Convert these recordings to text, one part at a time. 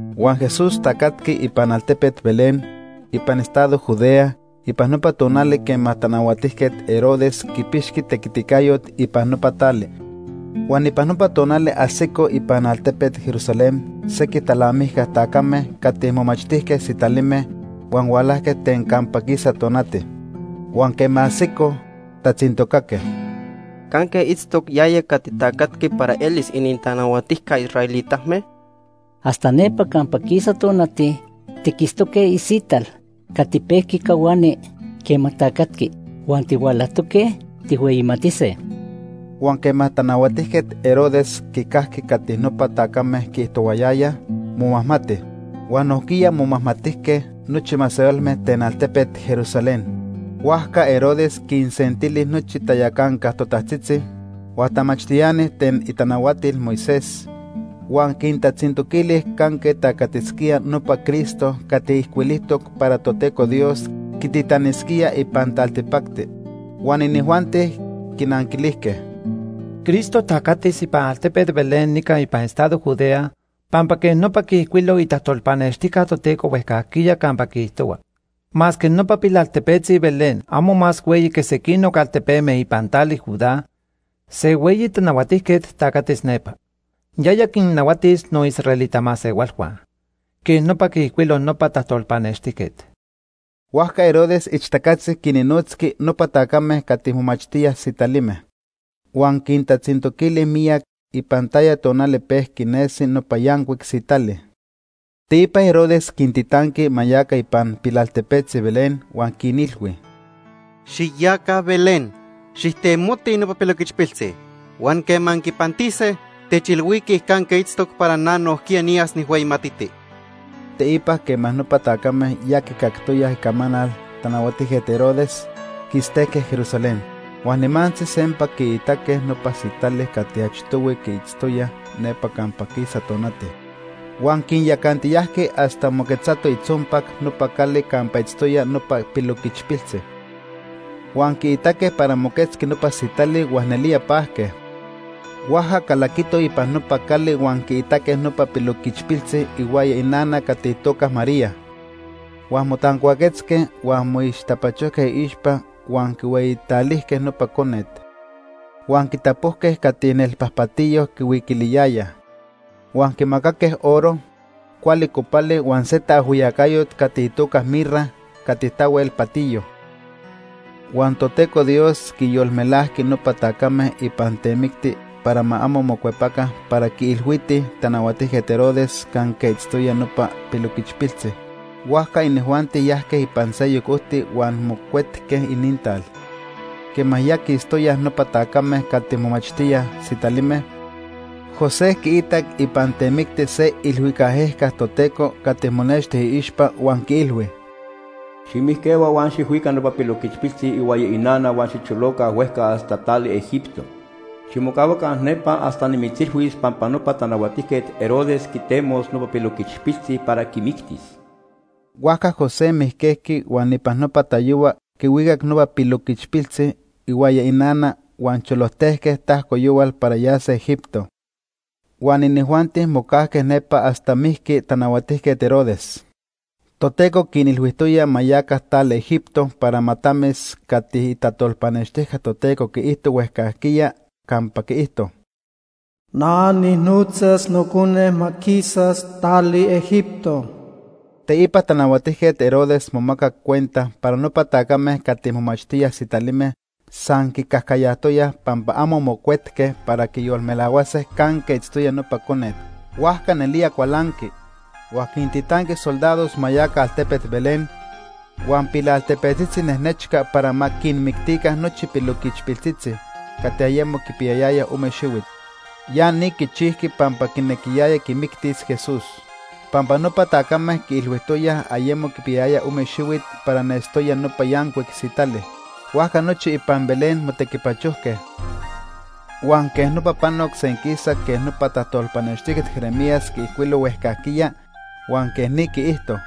Huan Jesús tacatqui ipan altepet Belén ipan estado Judea ipan nopa tonali quema Tanahuatijquet Herodes Herodes el Grande. quipixqui tequiticayot ipan nopa tali. Huan ipan nopa tonali ajsicoj ipan altepet Jerusalén sequij talnamijca tacame cati momachtijque sitalime huan hualajque ten campa quisa tonati. Huan quema ajsicoj, tatzintocaque: ―¿Canque itztoc yaya cati tacatqui para elis inintanahuatijca israelitame? Hasta nepa campa quisa tonati, tiquitztoque isital cati pejqui cahuani quema tacatqui. Huan tihualajtoque tijhueyimatise. Huan quema Tanahuatijquet Herodes quicajqui cati nopa tacame quiijtohuayayaj, momajmati. Huan nojquiya momajmatijque nochi masehualme ten altepet Jerusalén. Huajca Herodes quinsentili nochi tayacanca totajtzitzi, huan tamachtiani ten itanahuatil Moisés, huan quintatzintoquili canque tacatisquía nopa Cristo cati ijcuilijtoc para Toteco Dios quititanisquía ipan taltipacti. Huan inijuanti quinanquilijque: ―Cristo tacatis ipan altepet Belén nica ipan estado Judea pampa quej nopa quiijcuilo itajtolpanextijca Toteco huejcajquiya campa quiijtohua: ‘Masque nopa pilaltepetzi Belén amo más hueyi quej sequinoc altepeme ipan tali Judá, se hueyi tanahuatijquet tacatis nepa. Yaya quinnahuatis noisraelita masehualhua.’ Quej nopa quiijcuilo nopa tajtolpanextijquet. Huajca Herodes ixtacatzi quinnotzqui nopa tacame cati momachtíaj sitalime. Huan quintatzintoquili miyac ipan taya tonali pejqui nesi nopa yancuic sitali. Teipa Herodes quintitanqui ma yaca ipan pilaltepetzi Belén huan quinilhui: ―Xiyaca Belén, xijtemotij nopa piloquichpiltzi, huan quema anquipantise, techilhuiquij canque itztoc para na nojquiya niyas nijhueyimatiti. Teipa quema nopa tacame ya quicactoyaj icamanal Tanahuatijquet Herodes, quistejque Jerusalén. Huan nimantzi sempa quiitaque nopa sitali cati achtohui quiitztoyaj nepa campa quisa tonati. Huan quinyacantiyajqui hasta moquetzato itzompac nopa cali campa itztoya nopa piloquichpiltzi. Huan quiitaque para moquetzqui nopa sitali huan nelía pajque. Huajca calaquitoj ipan nopa cali huan quiitaque nopa piloquichpiltzi ihuaya inana cati itoca María. Huan motancuaquetzque huan moixtapachojque iixpa huan quihueyitalijque nopa conet. Huan quitapojque cati nelpajpatiyo quihuiquiliyayaj. Huan quimacaque oro, cuali copali huan se taajhuiyacayot cati itoca mirra cati tahuel patiyo. Huan Toteco Dios quinyolmelajqui nopa tacame ipan temicti para ma amo mocuepaca para quiilhuitij Tanahuatijquet Herodes canque itztoya nopa piloquichpiltzi. Huajca inijuanti yajque ipan seyoc ojti huan mocuetque inintal. Quema ya quistoyaj nopa tacame cati momachtíaj sitalime, José quiitac ipan temicti se iilhuicac ejca Toteco cati monexti iixpa huan quiilhui: “Ximijquehua huan xijhuica nopa piloquichpiltzi ihuaya inana huan xicholoca huejca hasta tali Egipto. Ximocahuaca nepa hasta nimitzilhuis pampa nopa Tanahuatijquet Herodes quitemos nopa piloquichpiltzi para quimictis.” Huajca José mijquejqui huan ipan nopa tayohua quihuicac nopa piloquichpiltzi ihuaya inana huan cholojtejque tajco yohual para yase Egipto. Huan inijuanti mocajque nepa hasta mijqui Tanahuatijquet Herodes. Toteco quinilhuijtoya ma yaca tali Egipto para ma tamis cati itajtolpanextijca Toteco quiijto huejcajquiya campa quiijto: “Na nijnotzas Nocone ma quisas tali Egipto.” Teipa Tanahuatijquet Herodes momacac cuenta para nopa tacame cati momachtíaj sitalime san quicajcayajtoyaj pampa amo mocuetque para quiyolmelahuase canque itztoya nopa conet. Huajca nelía cualanqui, huan quintitanqui soldados ma yaca altepet Belén huan pilaltepetzitzi nejnechca para ma quinmictica nochi piloquichpiltzitzi cati ayemo quipiyayayaj ome xihuit. Ya ni quichijqui pampa quinequiyaya quimictis Jesús, pampa nopa tacame quiilhuijtoyaj ayemo quipiyayaya ome xihuit para nestoya nopa yancuic sitali. Huajca nochi ipan Belén motequipachojque, huan quej nopa panoc senquisa quej nopa tajtolpanextijquet Jeremías quiijcuilo huejcajquiya, huan quej ni quiijto: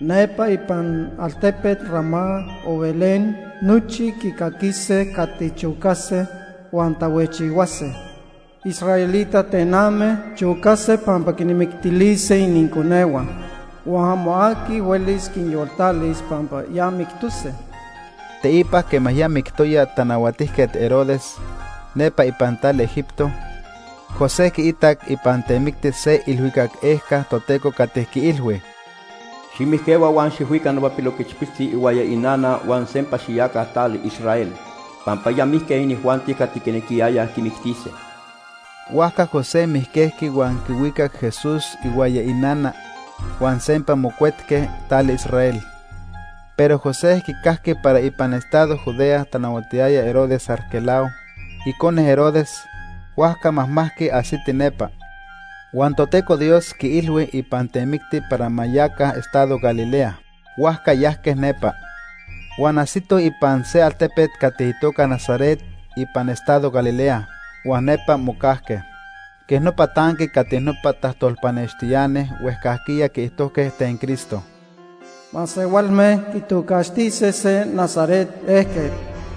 “Nepa ipan altepet Ramá o Belén nochi quicaquise cati chocase huan tahuejchihuase. Israelita tename chocase pampa quinmictilise ininconehua. Huan amo aqui huelis quinyoltalis pampa ya mictose.” Teipa quema ya mictoya Tanahuatijquet Herodes, nepa ipan tali Egipto, José quiitac ipan temicti se iilhuicac ejca Toteco cati quiilhui: “Ximijquehua huan xijhuica nopa piloquichpiltzi ihuaya inana huan sempa xiyaca tali Israel, pampa ya mijque inijuanti cati quinequiyayaj quimictise.” Huajca José mijquejqui huan quihuicac Jesús ihuaya inana, huan sempa mocuetque tali Israel. Pero José quicajqui para ipan estado Judea tanahuatiyaya Herodes Arquelao, icone Herodes, huajca majmajqui ajsiti nepa. Huan Toteco Dios quiilhui ipan temicti para ma yaca estado Galilea, huajca yajque nepa. Huan ajsitoj ipan se altepet cati itoca Nazaret ipan estado Galilea, huan nepa mocajque. Quej nopa tanqui cati nopa tajtolpanextiani huejcajquiya quiijtojque ten Cristo: “Masehualme quitocaxtise se Nazaret ejquet.”